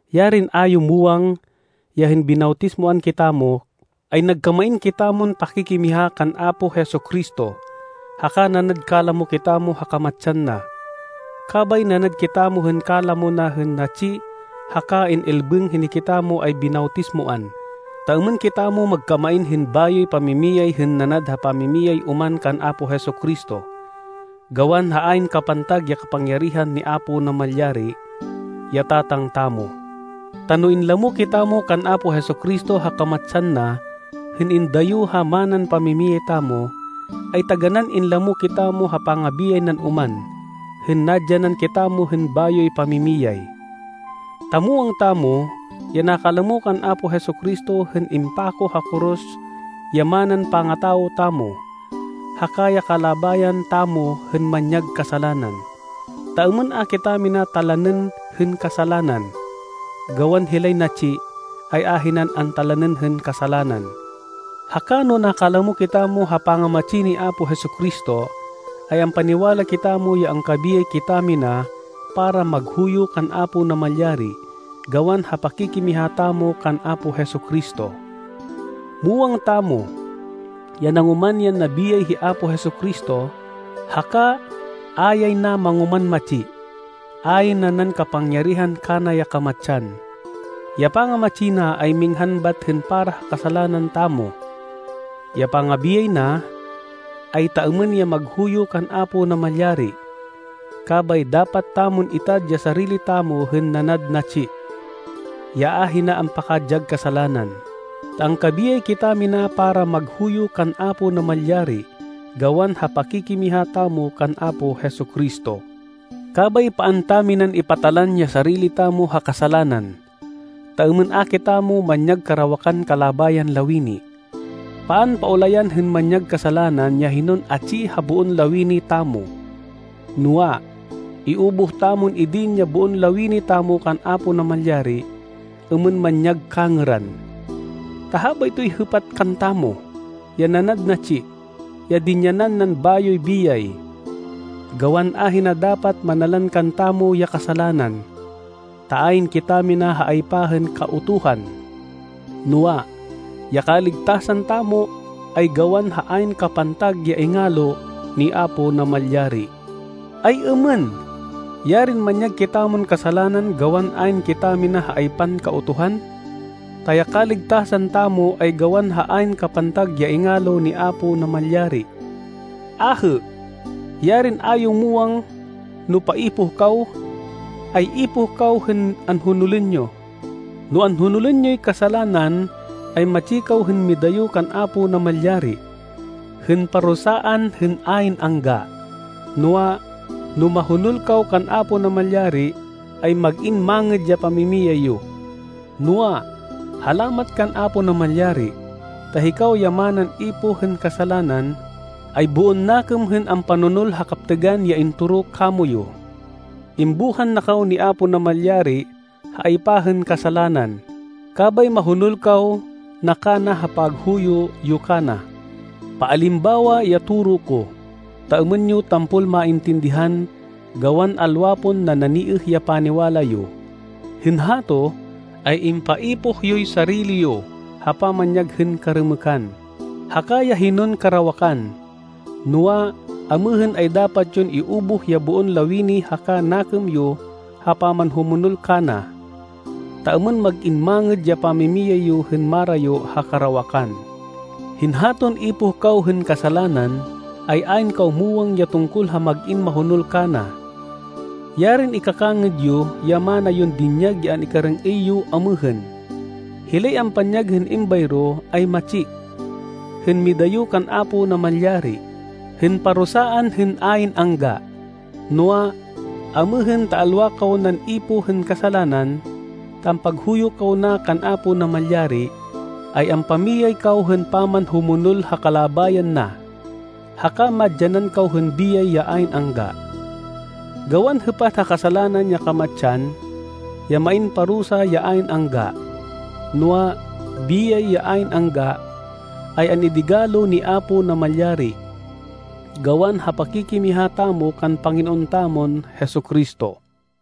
Yarin a yo muwang ya hên binawtismoan kitamo, ay nagkamain kitamon pakikimiha kan Apo Jesu-Cristo, haka nanad kalamo kitamo ha kamatsan na! Kabay nanad kitamo hên kalamo na hên natsi haka in-ilbêng hên hikitamo ay binawtismoan, ta êmên kitamo magkamain hên bayoy pamimiyay hên nanad ha pamamiyay oman kan Apo Jesu-Cristo, gawan ha ayn kapantag ya kapangyarihan ni Apo Namalyari, ya Tatang tamo. Ta no inlamo kitamo kan Apo Jesu-Cristo ha kamatsan na hên indayo ha manan pamimiyay tamo, ay taganán inlamo kitamo ha pangabiyay nan oman hên nadyanan kitamo hên bayoy pamimiyay. Ta muwang tamo ya nakalamo kan Apo Jesu-Cristo hên impako ha koros ya manan pangatawo tamo, haka ya kalabayan tamo hên manyag kasalanan, ta êmên a kitamina talanên hên kasalanan. Gawan hilay natsi, ay ahinan antalanên hên kasalanan. Haka no nakalamo kitamo ha pangamatsi ni Apo Jesu-Cristo, ay ampaniwala kitamo ya angkabiyay kitamina para maghuyo kan Apo Namalyari gawan ha pakikimiha tamo kan Apo Jesu-Cristo. Muwang tamo ya nangoman yan nabiyay hi Apo Jesu-Cristo, haka a yay na mangoman matsi. Ayn nanan kapangyarihan kana ya kamatsan. Ya pangamatsi na ay minghan bat hên para ha kasalanan tamo. Ya pangabiyay na, ay ta êmên ya maghuyo kan Apo Namalyari. Kabay dapat tamon itad ya sarili tamo hên nanad natsi, ya ahina ampakadyag kasalanan, ta angkabiyay kitamina para maghuyo kan Apo Namalyari gawan ha pakikimiha tamo kan Apo Jesu-Cristo. Kabay paan taminan ipatalan ya sarili tamo ha kasalanan, ta êmên a kitamo manyag karawakan kalabayan lawini. Paan paulayan hên manyag kasalanan ya hinon atsi ha boon lawini tamo. Noa, iubuh tamon idin ya boon lawini tamo kan Apo Namalyari êmên manyag kangêran, ta habaytoy hêpat kantamo, ya nanad natsi, ya dinyanan nan bayoy biyay. Gawan ahina dapat manalan kantamo ya kasalanan, ta ayn kitamina ha aypa hên Kautuhan, noa, ya kaligtasan tamo ay gawan ha ayn kapantag ya ingalo ni Apo Namalyari. Ay-êmên? Yarin manyag kitamon kasalanan gawan ayn kitamina ha aypan Kautuhan, ta ya kaligtasan tamo ay gawan ha ayn kapantag ya ingalo ni Apo Namalyari! Ahê! Yarin a yo muwang no paipoh kaw, ay ipoh kaw hên anhonolên yo! No anhonolên yoy kasalanan, ay matsi kaw hên midayo kan Apo Namalyari, hên parusaan hên ayn angga. Noa, no mahonol kaw kan Apo Namalyari, ay mag-in mangêd ya pamimiyay yo. Noa, halamat kan Apo Namalyari, ta hikaw ya manan ipoh hên kasalanan, ay boon nakêm hên ampanonol ha kaptêgan ya intoro kamoyu. Imbuhan na kaw ni Apo Namalyari ha aypa hên kasalanan, kabay mahonol kaw na kana ha paghuyo yo kana. Paalimbawa ya toro ko, ta êmên yo tampol maintindihan gawan alwa pon nananiêh ya paniwala yo. Hên hato, ay impaipoh yoy sarili yo ha pamanyag hên karêmêkan, haka ya hinon karawakan. Noa, amêhên ay dapat yon iubuh ya boon lawini haka nakêm yo ha pamanhumonol kana, ta êmên mag-in mangêd ya pamimiyay yo hên marayo ha karawakan. Hên haton ipoh kaw hên kasalanan ay ayn kaw muwang ya tungkol ha mag-in mahonol kana. Yarin ikakangêd yo ya mana yon dinyag ya an-ikarêng-êy yo amêhên! Hilay ampanyag hên êmbayro ay matsi, hên midayo kan Apo Namalyari, hên parusaan hên ayn angga. Noa, amêhên ta alwa kaw nan ipoh hên kasalanan, ta ampaghuyo kaw na kan Apo Namalyari, ay ampamiyay kaw hên pamanhumonol ha kalabayan na, haka madyanan kaw hên biyay ya ayn angga. Gawan hêpat ha kasalanan ya kamatsan, ya main parusa ya ayn angga, noa, biyay ya ayn angga, ay an-idigalo ni Apo Namalyari, gawan ha pakikimiha tamo kan Panginoon tamon Jesu-Cristo.